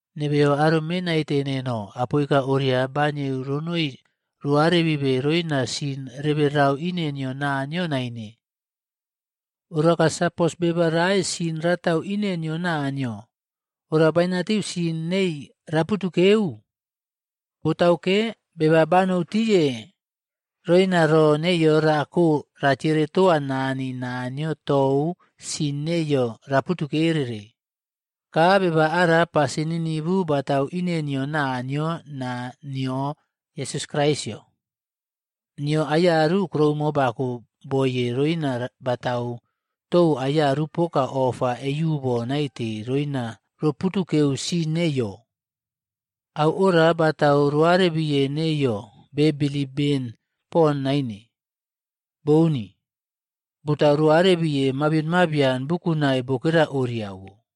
Nebeyo aro mee naite neno, apoika oria banieu ronoi roꞌarebibe roina sin reberau ine nio Naniyo naine. Oraka sapos beba rae sin ratau ine nio Naniyo, ora bainatiu sin nei raputukeu. Botauke, beba banoutiye roina ro neiyo rakoa ratiere toa Nani Naniyo tou sin neiyo raputukereꞌre. Ka beba ara pasin ninivu batatu ine nio Naniyo naa nio Yesus Kraisꞌyo. Nio aiyaru kuroumo bako boiye roina batau tou aiyaru poka ofa eiubo naite roina roputukeu sin neiyo. Au oria batau roarebiye neiyo be bilip ben poni naine, bouni, batau roꞌarebire mabion mabian bukunai bokera oriawo.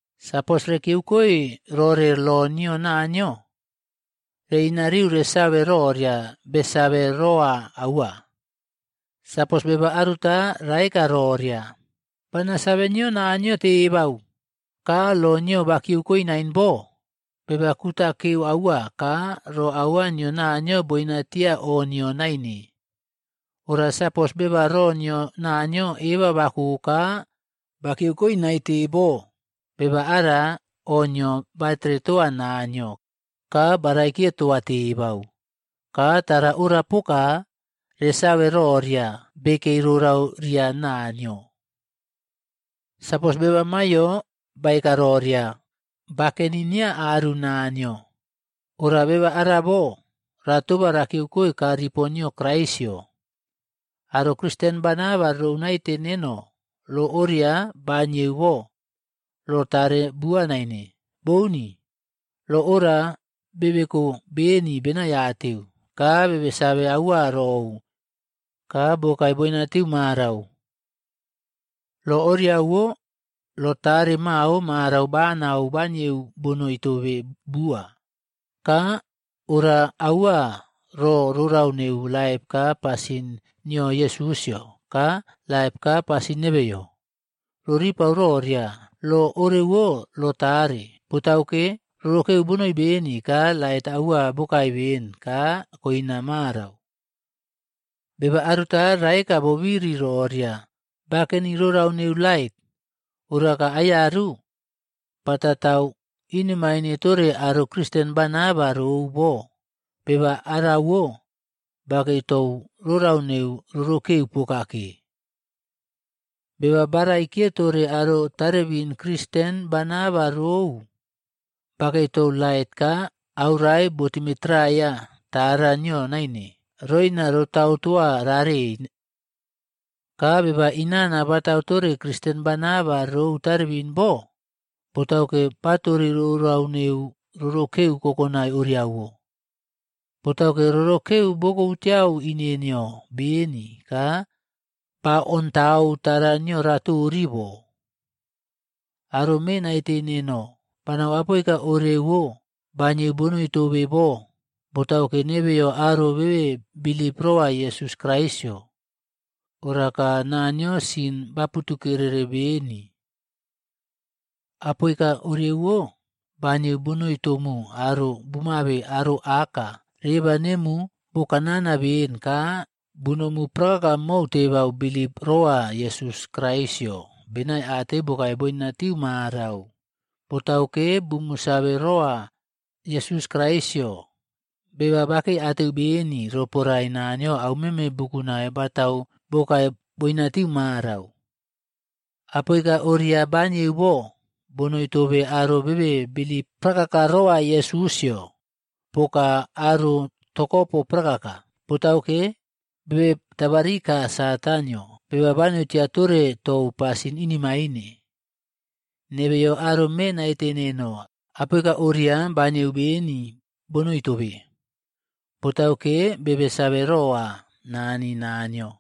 Sapos rekiyeukoe rore lo nio Naniyo, reꞌinariu resave roria besave roa aua. Sapos beba aruta raeka roria, “Bana save nio Naniyo tebau,” ka lo nio bakiyeukoe nain bo, beba kutakeu aua ka ro aua nio Naniyo boinatia o nio naine. Ora sapos beba ro nio Naniyo eba bako ka bakiyeukoe naite bo, beba ara o nio batere toa Naniyo ka baraikiye toa tebau. Ka tara ora poka, resave roria bekei rorau ria Naniyo. Sapos beba maiyo baeka roria, bakeni nia aru Naniyo, ora beba arabo ratoba rakiyeukoe kaa ripo nio Kraisꞌyo. Aro Kristen bana ba rou naite neno lo oria baniyeu bo, lo tare bua naine. Bouni. Lo ora bebeko beni benaiateu, ka bebe save aua rou, ka bokae boinatiu marau. Lo oriawo lo tare mao marau banau banieu bonoi tobe bua, ka ora aua ro rorau neu laip ka pasin nio Yesusꞌyo ka laip ka pasin nebeyo, roripau roria lo orewo lo tare. Botauke, rorokeu bonoi beni ka lait aua bokae beni ka koina marau. Beba aruta raeka bobiri roria bakeni rorau neu lait, oraka aiyaru batatau inemaine tore aro Kristen bana ba rou bo, beba rorauwo bakei tou rorau neu rorokeu pokake. Beba baraikiye tore aro tarebin Kristen bana ba rou, bakei tou lait ka aurae botimetraiya tara nio naine roina rotautoa rarei. Ka beba inana batautore kristen bana ba rou tarebin bo, botauke batori rorau neu rorokeu kokonai oriawo. Botauke, rorokeu bokobutiyau ine nio beni ka baontau tara nio ratori bo. Aro me naite neno, banau apoika orewo banieu bonoi tobe bo botauke, nebeyo aro bebe bilip rowa Yesus Kraisꞌyo. Oraka Naniyo sin baputukereꞌre beni. Apoika orewo banieu bonoi tomu aro bumuabe aro aka reba nemu bokanana beni ka bunomu prakaka mou tebau bilip roa Yesus Kraisꞌyo benaiateu bokae boina tiu marau, botauke bumu save roa Yesus Kraisꞌyo, beba bakeiateu beni roporae Naniyo aumeme bukunai batau bokae boinatiu marau. Apoika oria banieu bo, bonoi tobe aro bebe bilip prakaka rowa Yesusꞌyo, poka aro tokopo prakaka. Botauke, bebe tabarika Satanꞌyo, beba banoi tia tore tou pasin inemaine. Nebeyo aro mee naite neno, apoika oria banieu beni bonoi tobe botauke, bebe save rowa Nani Naniyo.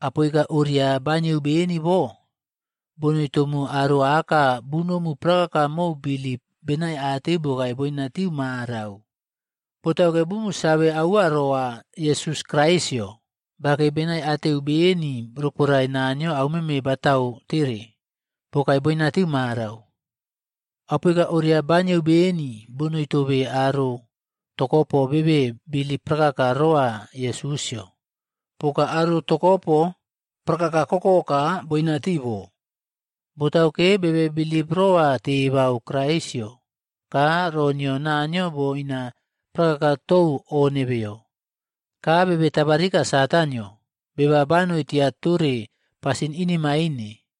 Apoika oria banieu beni bo, bonoi tomu aro aka bunomu prakaka mou bilip benaiateu bokae boina tiu marau. Botauke bumu save aua rowa Yesus Kraisꞌyo, bakei benaiateu beni roporae Naniyo aumeme batau tere, bokae boinatiu marau. Apoika ora banieu beni bonoi tobe aro tokopo bebe bilip prakaka roa Yesusꞌyo poka aro tokopo prakaka kokoka boinatii bo. Botauke, bebe bilip roa tebau Kraisꞌyo ka ro nio Naniyo boina prakaka tou o nebeyo, ka bebe tabarika Satanꞌyo, beba banoi tia tore pasin inemaine.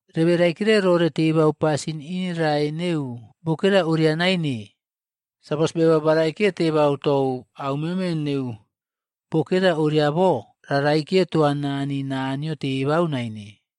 Rebe raikire rore tebau pasin inerae neu bokera oria naine. Sapos beba baraikiye tebau tou aumeme neu bokera oria bo, ra raikiye toa Nani Naniyo tebau naine.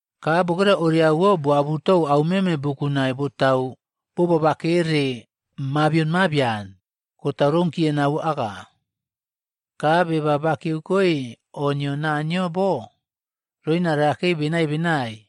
Ka bokera oriawo boabutou aumeme bukunai botau bobabakere mabion mabian, kotau rounkiye nau aka. Ka beba bakiyeukoe o nio Naniyo bo, roina rakei benai benai.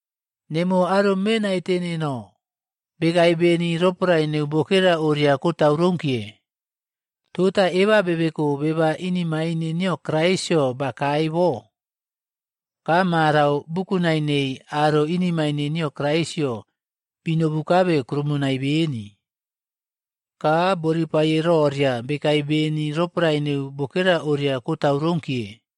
Nemuwo aro mee naite neno, bekae beni roporae neu bokera oria kotau rounkiye.b Tota eba bebeko beba inemaine nio Kraisꞌyo bakae bo. Ka marau, bukunai nei aro inemaine nio Kraisꞌyo binobukabe krumonai beni. Ka boripaye roria bekae beni roporae neu bokera oria kotau rounkiye.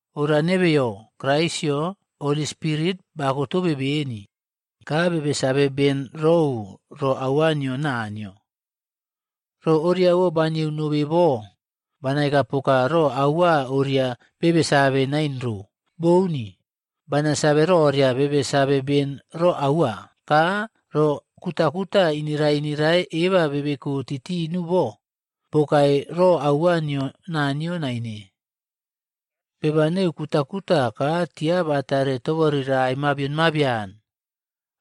Ora nebeyo, Kraisꞌyo Holy Spirit bakotobe beni. Ka bebe save beni rou ro aua nio Naniyo. Ro oriawo banieu nobe bo, banaekapoka ro aua oria bebe save nain ro. Bouni! Bana save roria bebe save beni ro aua, ka ro kutakuta inerae inerae eba bebeko titinu bo, bokae ro aua nio Naniyo naine. Beba neu kutakuta ka tia batare toborirae mabion mabian,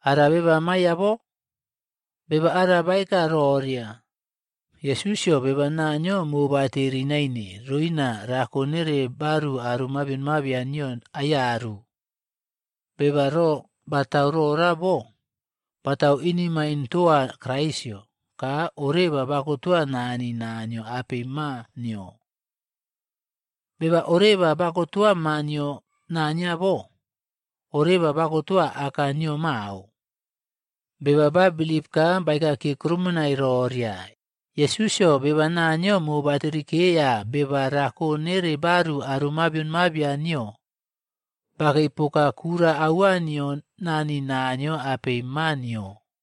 ara beba maiya bo? Beba ara baeka roria, “Yesusꞌyo beba Naniyo mobateri naine roina rako nere baru aro mabion mabian nio aiyaru.” Beba ro batau rora bo, batau inemaine toa Kraisꞌyo ka oreba bakotowa Nani Naniyo apei Maa nio. Beba oreba bakotowa maa nio Naniyo bo, oreba bakotoa Aka nio mao. Beba ba bilip ka baekakiye krumonai roria, “Yesusꞌyo, beba Naniyo mobaterikeya beba rako nere baru aro mabion mabian nio,” bakei poka kura aua nio Nani Naniyo apei Maa nio.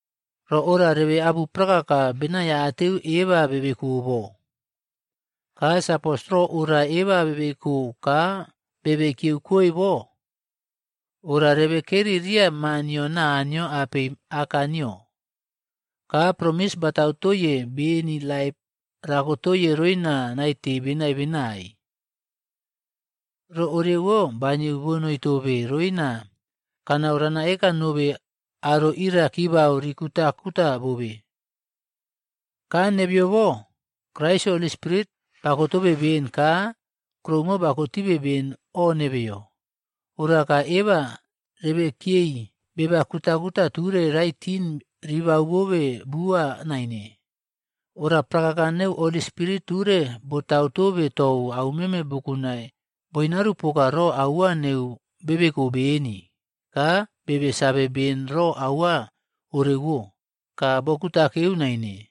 Ro ora rebe abu prakaka benaiateu eba bebeko bo. Ka sapos ro ora eba bebeko ka bebe kiyeukoe bo, ora rebekeri riya Maa nio Naniyo apei Aka nio. Ka promis batau toiye beni laip rakotoye roina naite benai benai. Ro orewo banieu bonoi tobe roina kanau ranaeka nobe aro ira kibau rikutakuta bobe. Ka nebeyo bo, Kraisꞌyo Holy Spirit bakotobe beni ka kuroumo bakotibe beni o nebeyo. Ora ka eba rebekiyei beba kutakuta ture raitin ribau tobe bua naine. Ora prakaka neu Holi Spirit ture botau tobe tou aumeme bukunai boinarupoka ro aua neu bebeko beni ka bebe save beni ro aua orewo ka bokutakeu naine.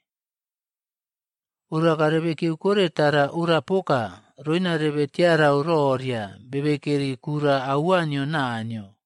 Oraka rebe kiyeukore tara ora poka, roina rebe tiarau roria bebekeri kura aua nio Naniyo.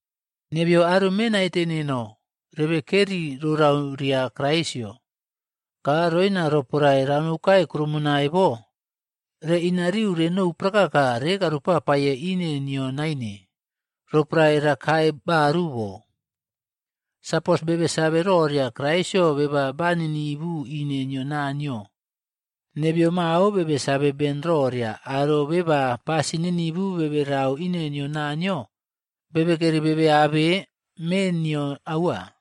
Nebeyo aro mee naite neno, rebe keri rorau ria Kraisꞌyo. Ka roina roporae ranoukae kuroumonai bo, reꞌinariu renou prakaka rekaropapaiye ine niyo naine roporae rakae baru bo. Sapos rebe save roria Kraisꞌyo beba ba ninivu ine nio Naniyo, nebeyo mao bebe save beni roria aro beba pasin ninivu berau ine nio Naniyo, bekeri bebe abe mee nino aua.